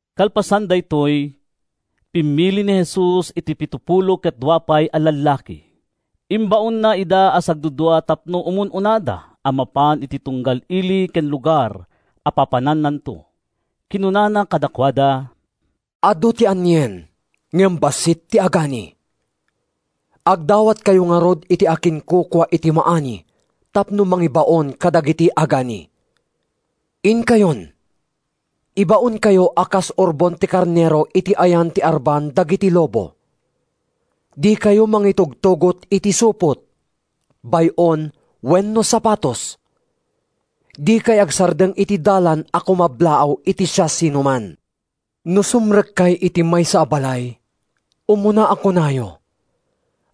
Kalpasan daytoy, pimmili ni Jesus iti pitopulo ket dua pay a lallaki. Imbaonna ida a sagdudua tapno umun-unada a mapan iti tunggal ili ken lugar a papanannanto. Kinunana kadakuada, “Adu ti anien, ngem bassit ti agani. Agdawatkayo ngarud iti akinkukua iti maani tapno mangibaon kadagiti agani. Inkayon! Ibaonkayo a kas urbon ti karnero iti ayan ti arban dagiti lobo. Dikayo mangitugtugot iti supot, bay-on wenno sapatos. Dikay agsardeng iti dalan a kumablaaw iti siasinoman. No sumrekkay iti maysa a balay, umuna a kunayo: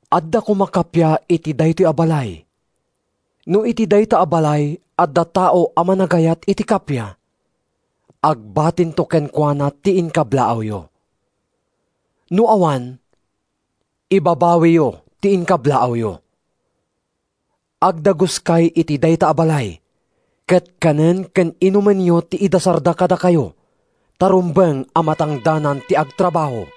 ‘Adda koma kappia iti daytoy a balay.’ No iti dayta a balay adda tao a managayat iti kappia, agbatinto kenkuana ti inkablaawyo. No awan, ibabawiyo ti inkablaawyo. Agdaguskay iti dayta a balay, ket kanen ken inumenyo ti idasarda kadakayo ta rumbeng a matangdanan ti agtrabaho.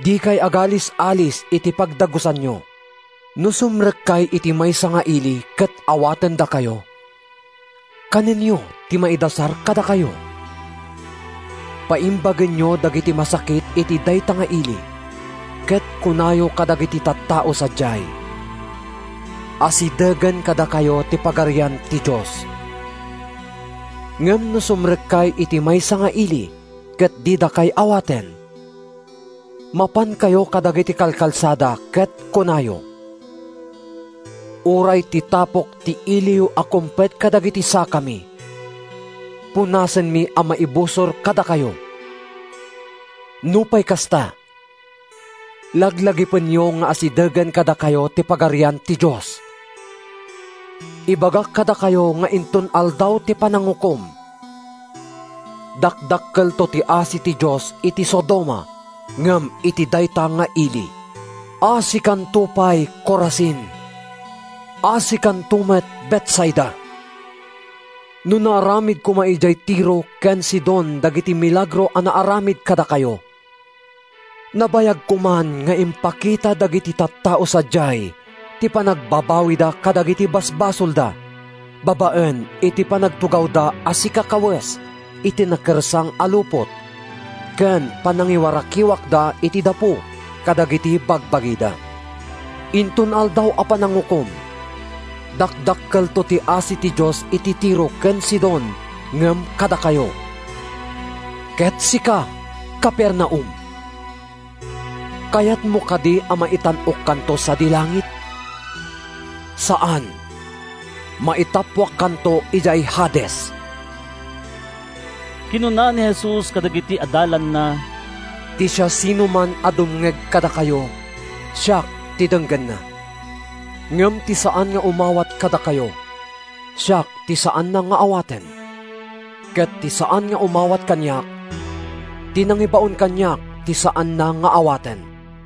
Dikay agalis-alis iti pagdagusanyo. No sumrekkay iti maysa nga ili ket awatendakayo, kanenyo ti maidasar kadakayo. Paimbagenyo dagiti masakit iti dayta nga ili ket kunayo kadagiti tattao sadiay, ‘Asidegen kadakayo ti Pagarian ti Dios.’ Ngem no sumrekkay iti maysa nga ili ket didakay awaten, mapankayo kadagiti kalkalsada ket kunayo: ‘Uray ti tapok ti iliyo a kumpet kadagiti sakami, punasenmi a maibusor kadakayo. Nupay kasta, laglagipenyo nga asidegen kadakayo ti Pagarian ti Dios!’ Ibagak kadakayo nga inton Aldaw ti Panangukom, dakdakkelto ti asi ti Dios iti Sodoma ngem iti dayta nga ili!” “Asikanto pay, Corazin! Asikanto met, Betsaida! No naaramid koma idiay Tiro ken Sidon dagiti milagro a naaramid kadakayo, nabayag koman nga impakita dagiti tattao sadiay ti panagbabawida kadagiti basbasolda babaen iti panagtugawda a sikakawes iti nakersang a lupot ken panangiwarakiwakda iti dapu kadagiti bagbagida. Inton Aldaw a Panangukom, dakdakkelto ti asi ti Dios iti Tiro ken Sidon ngem kadakayo. Ket sika, Capernaum, kayatmo kadi a maitan-okkanto sadi langit? Saan! Maitappuakkanto idiay Hades.” Kinuna ni Jesus kadagiti adalanna, “Ti siasinoman a dumngeg kadakayo, siak ti denggenna. Ngem ti saan nga umawat kadakayo, siak ti saanna nga awaten. Ket ti saan nga umawat kaniak, ti nangibaon kaniak ti saanna nga awaten.”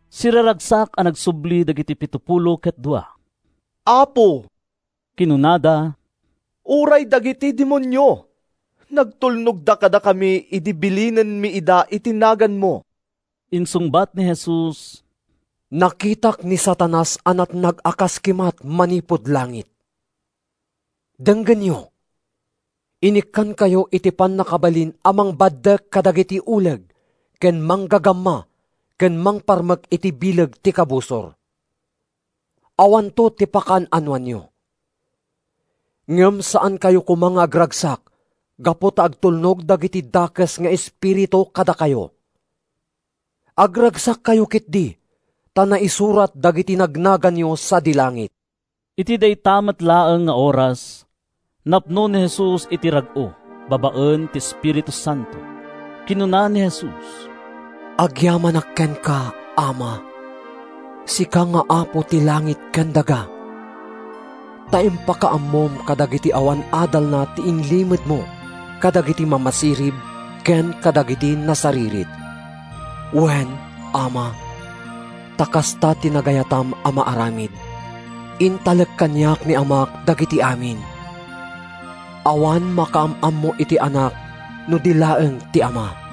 Siraragsak a nagsubli dagiti pitopulo ket dua. “Apo,” kinunada, “uray dagiti demonio nagtulnogda kadakami idi bilinenmi ida iti naganmo!” Insungbat ni Jesus, “Nakitak ni Satanas a natnag a kas kimat manipud langit. Denggenyo: Inikkankayo iti pannakabalin a mangbaddek kadagiti uleg ken manggagama ken mangparmek iti bileg ti Kabusor. Awanto ti pakaan-anoanyo. Ngem saankayo koma nga agragsak gapu ta agtulnog dagiti dakes nga espiritu kadakayo. Agragsakkayo ketdi ta naisurat dagiti nagnaganyo sadi langit.” Iti dayta met laeng nga oras, napno ni Jesus iti rag-o babaen ti Espiritu Santo. Kinuna ni Jesus, “Agyamanak kenka, Ama, sika nga Apo ti langit ken daga, ta impakaammom kadagiti awan adalna ti inlimedmo kadagiti mamasirib ken kadagiti nasaririt. Wen, Ama, ta kasta ti nagayatam a maaramid. “Intalek kaniak ni Amak dagiti amin. Awan makaam-ammo iti Anak no di laeng ti Ama.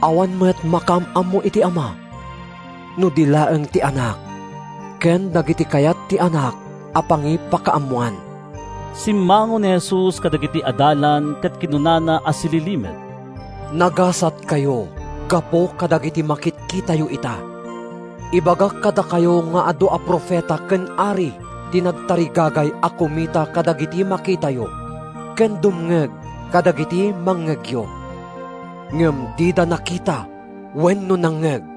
Awan met makaam-ammo iti Ama no di laeng ti Anak ken dagiti kayat ti Anak a pangipakaammoan.” Simmango ni Jesus kadagiti adalan ket kinunana a sililimed, “Nagasatkayo gapu kadagiti makitkitayo ita! Ibagak kadakayo nga adu a profeta ken ari ti nagtarigagay a kumita kadagiti makitayo, ken dumngeg kadagiti mangngegyo. Ngem dida nakita wenno nangngeg.”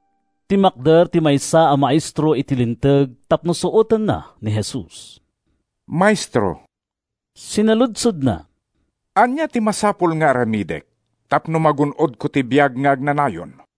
Timmakder ti maysa a maestro iti Linteg tapno suotenna ni Jesus. “Maestro,” sinaludsodna, “ania ti masapul nga aramidek tapno magun-odko ti biag nga agnanayon?”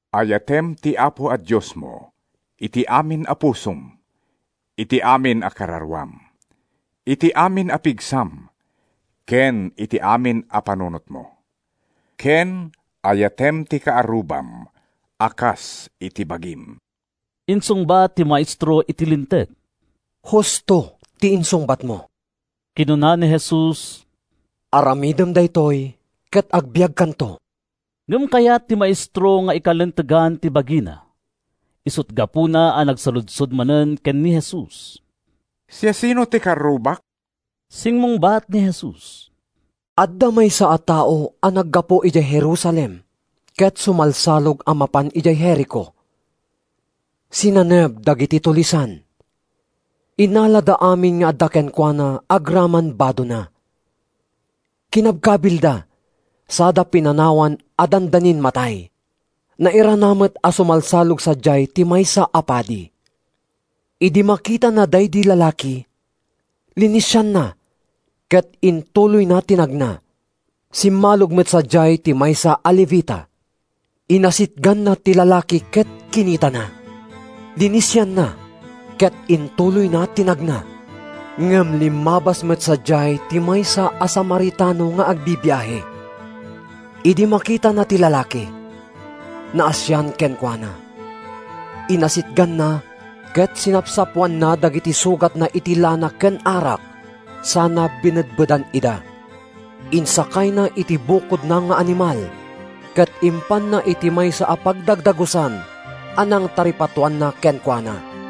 “‘Ayatem ti Apo a Diosmo iti amin a pusom, iti amin a kararuam, iti amin a pigsam ken iti amin a panunotmo,’ ken ‘Ayatem ti kaarrubam a kas iti bagim,’” insungbat ti maestro iti Linteg. “Husto ti insungbatmo,” kinuna ni Jesus. “Aramidem daytoy ket agbiagkanto.” Ngem kayat ti maestro nga ikalintegan ti bagina, isut’ gapuna a nagsaludsod manen ken ni Jesus, “Siasino ti kaarrubak?” Simmungbat ni Jesus: “Adda maysa a tao a naggapu idiay Jerusalem ket sumalsalog a mapan idiay Jerico. Sinaneb dagiti tulisan, innalada amin nga adda kenkuana agraman badona, kinabkabilda sada pinanawan a dandanin matay. Nairana met a sumalsalog sadiay ti maysa a padi. Idi makitana daydi lalaki, linisianna ket intuloyna ti nagna. Simmalog met sadiay ti maysa a Levita. Inasitganna ti lalaki ket kinitana. Linisianna ket intuloyna ti nagna. “Ngem limmabas met sadiay ti maysa a Samaritano nga agbibiahe. Idi makitana ti lalaki, naasian kenkuana. Inasitganna ket sinapsapoanna dagiti sugatna iti lana ken arak sana binedbedan ida. Insakayna iti bukodna nga animal ket impanna iti maysa a pagdagdagusan a nangtaripatoanna kenkuana.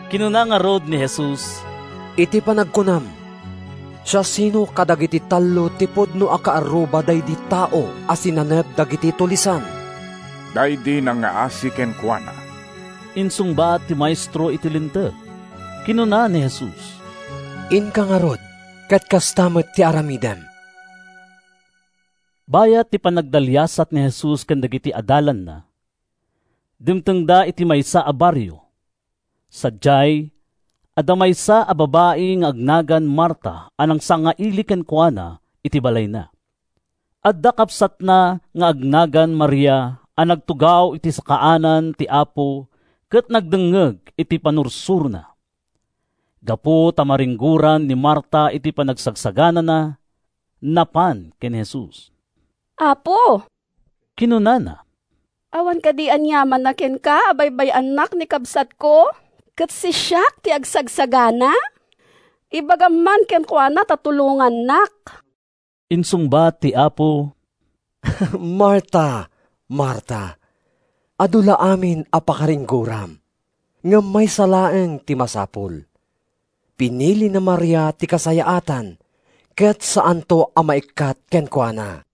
Kinuna ngarud ni Jesus, “Iti panagkunam, siasino kadagiti tallo ti pudno a kaarruba daydi tao a sinaneb dagiti tulisan?” “Daydi nangngaasi kenkuana,” insungbat ti maestro iti Linteg. Kinuna ni Jesus, “Inka ngarud ket kasta met ti aramidem.” Bayat ti panagdaliasat ni Jesus ken dagiti adalanna, dimtengda iti maysa a barrio. Sadiay, adda maysa a babai nga agnagan Marta a nangsangaili kenkuana iti balayna. Adda kabsatna nga agnagan Maria a nagtugaw iti sakaanan ti Apo ket nagdengngeg iti pannursurona. Gapu ta maringgoran ni Marta iti panagsaganana, napan ken ni Jesus. “Apo,” kinunana, “awan kadi aniamanna kenka a baybay-annak ni kabsatko ket sisiak ti agsagsagana? Ibagam man kenkuana ta tulongannak!” Insungbat ti Apo, “Marta, Marta, adu la amin a pakaringgoram. Ngem maysa laeng ti masapul. Pinili ni Maria ti kasayaatan ket saanto a maikkat kenkuana.”